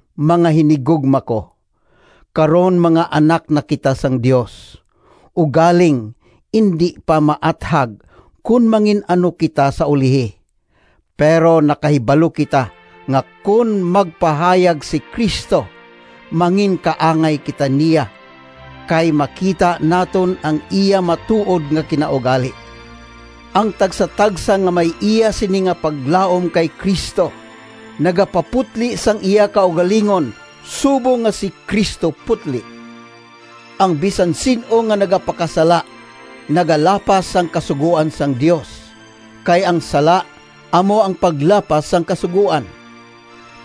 Mga hinigugma ko, karon mga anak na kita sang Dios, ugaling indi pa maathag kon mangin-ano kita sa ulihi. Pero nakahibalo kita nga kon magpahayag si Cristo, manginkaangay kita niya, kay makita naton ang iya matuod nga kinaugali. Ang tagsatagsa nga may iya sini nga paglaom kay Cristo nagapaputli sang iya kaugalingon subong nga si Cristo putli. Ang bisan sin-o nga nagapakasala nagalapas sang kasugoan sang Dios, kay ang sala amo ang paglapas sang kasugoan.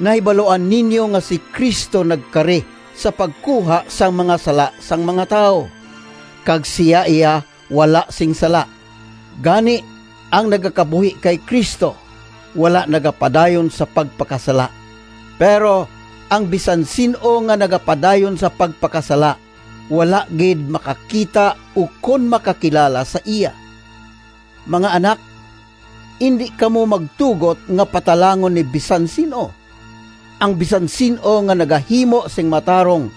Nahibaluan ninyo nga si Cristo nagkari sa pagkuha sang mga sala sang mga tawo, kag sia iya wala sing sala. Gani, ang nagakabuhi kay Cristo, wala nagapadayon sa pagpakasala, pero ang bisan sin-o nga nagapadayon sa pagpakasala, wala gid makakita ukon makakilala sa iya. Mga anak, indi kamo magtugot nga patalangon ni bisan sin-o! Ang bisan sin-o nga nagahimo sing matarong,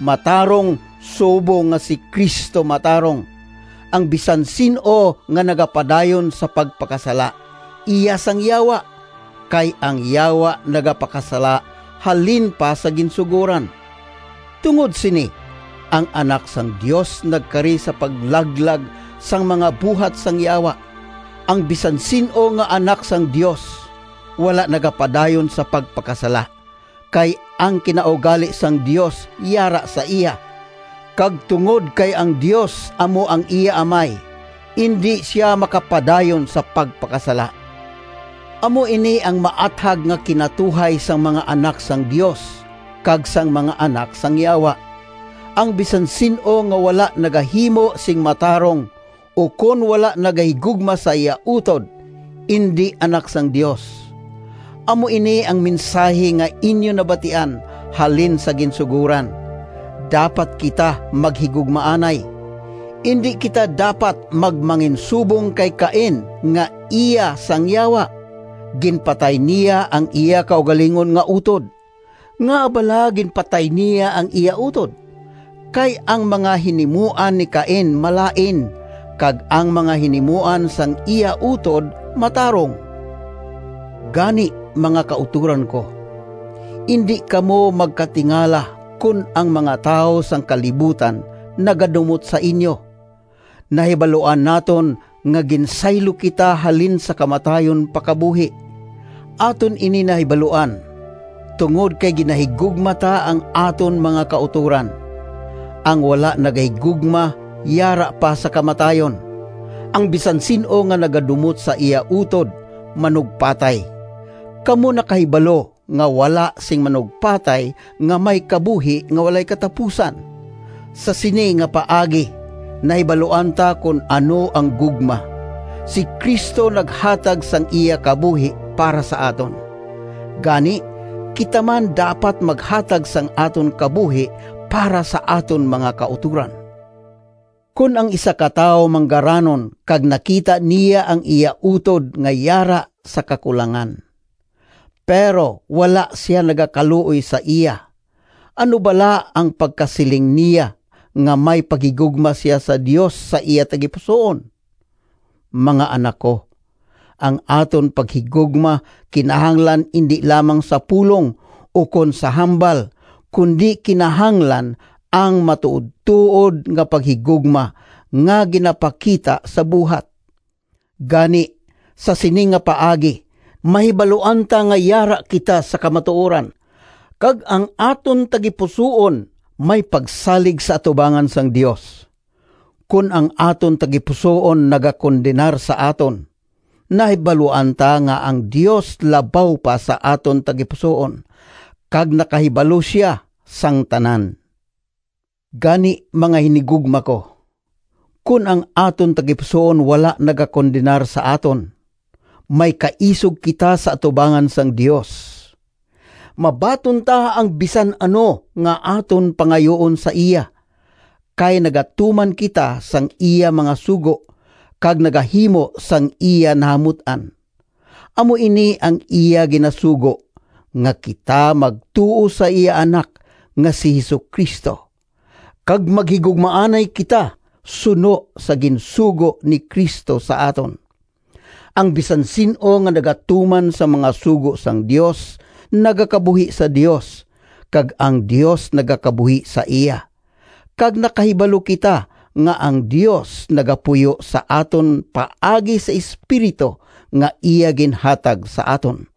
matarong subong nga si Cristo matarong. Ang bisan sin-o nga nagapadayon sa pagpakasala, iya sang Yawa, kay ang Yawa nagapakasala halin pa sa ginsugoran. Tungod sini ang Anak sang Dios nagkari sa paglaglag sang mga buhat sang Yawa. Ang bisan sin-o nga anak sang Dios wala nagapadayon sa pagpakasala, kay ang kinaugali sang Dios yara sa iya, kag tungod kay ang Dios amo ang iya Amay, indi sia makapadayon sa pagpakasala. Amo ini ang maathag nga kinatuhay sang mga anak sang Dios kag sang mga anak sang Yawa: ang bisan sin-o nga wala nagahimo sing matarong ukon wala nagahigugma sa iya utod, indi anak sang Dios. Amo ini ang mensahi nga inyo nabatian halin sa ginsugoran: dapat kita maghigugmaanay. Indi kita dapat magmanginsubong kay Cain nga iya sang Yawa. Ginpatay niya ang iya kaugalingon nga utod. Ngaa bala ginpatay niya ang iya utod? Kay ang mga hinimuan ni Cain malain, kag ang mga hinimuan sang iya utod matarong. Gani, mga kautoran ko, indi kamo magkatingala kon ang mga tawo sang kalibutan nagadumot sa inyo. Nahibaluan naton nga ginsaylo kita halin sa kamatayon pa kabuhi. Aton ini nahibaluan, tungod kay ginahigugma ta ang aton mga kautoran. Ang wala nagahigugma yara pa sa kamatayon. Ang bisan sin-o nga nagadumot sa iya utod, manugpatay. Kamo nakahibalo nga wala sing manugpatay nga may kabuhi nga walay katapusan. Sa sini nga paagi nahibaluan ta kon ano ang gugma: si Cristo naghatag sang iya kabuhi para sa aton. Gani kita man dapat maghatag sang aton kabuhi para sa aton mga kautoran! Kon ang isa ka tawo manggaranon kag nakita niya ang iya utod nga yara sa kakulangan, pero wala sia nagakaluoy sa iya, ano bala ang pagkasiling niya nga may paghigugma sia sa Dios sa iya tagipusoon? Mga anak ko! Ang aton paghigugma kinahanglan indi lamang sa pulong ukon sa hambal, kundi kinahanglan ang matuodtuod nga paghigugma nga ginapakita sa buhat. Gani sa sini nga paagi mahibaluan ta nga yara kita sa kamatuoran, kag ang aton tagipusoon may pagsalig sa atubangan sang Dios. Kon ang aton tagipusoon nagakondenar sa aton, nahibaluan ta nga ang Dios labaw pa sa aton tagipusoon, kag nakahibalo sia sang tanan. Gani, mga hinigugma ko, kon ang aton tagipusoon wala nagakondenar sa aton, may kaisog kita sa atubangan sang Dios. Mabaton ta ang bisan ano nga aton pangayuon sa iya, kay nagatuman kita sang iya mga sugo, kag nagahimo sang iya nahamut-an. Amo ini ang iya ginasugo: nga kita magtuo sa iya Anak nga si Jesu-Cristo, kag maghigugmaanay kita suno sa ginsugo ni Cristo sa aton. Ang bisan sin-o nga nagatuman sang mga sugo sang Dios nagakabuhi sa Dios, kag ang Dios nagakabuhi sa iya. Kag nakahibalo kita nga ang Dios nagapuyo sa aton paagi sa Espiritu nga iya ginhatag sa aton.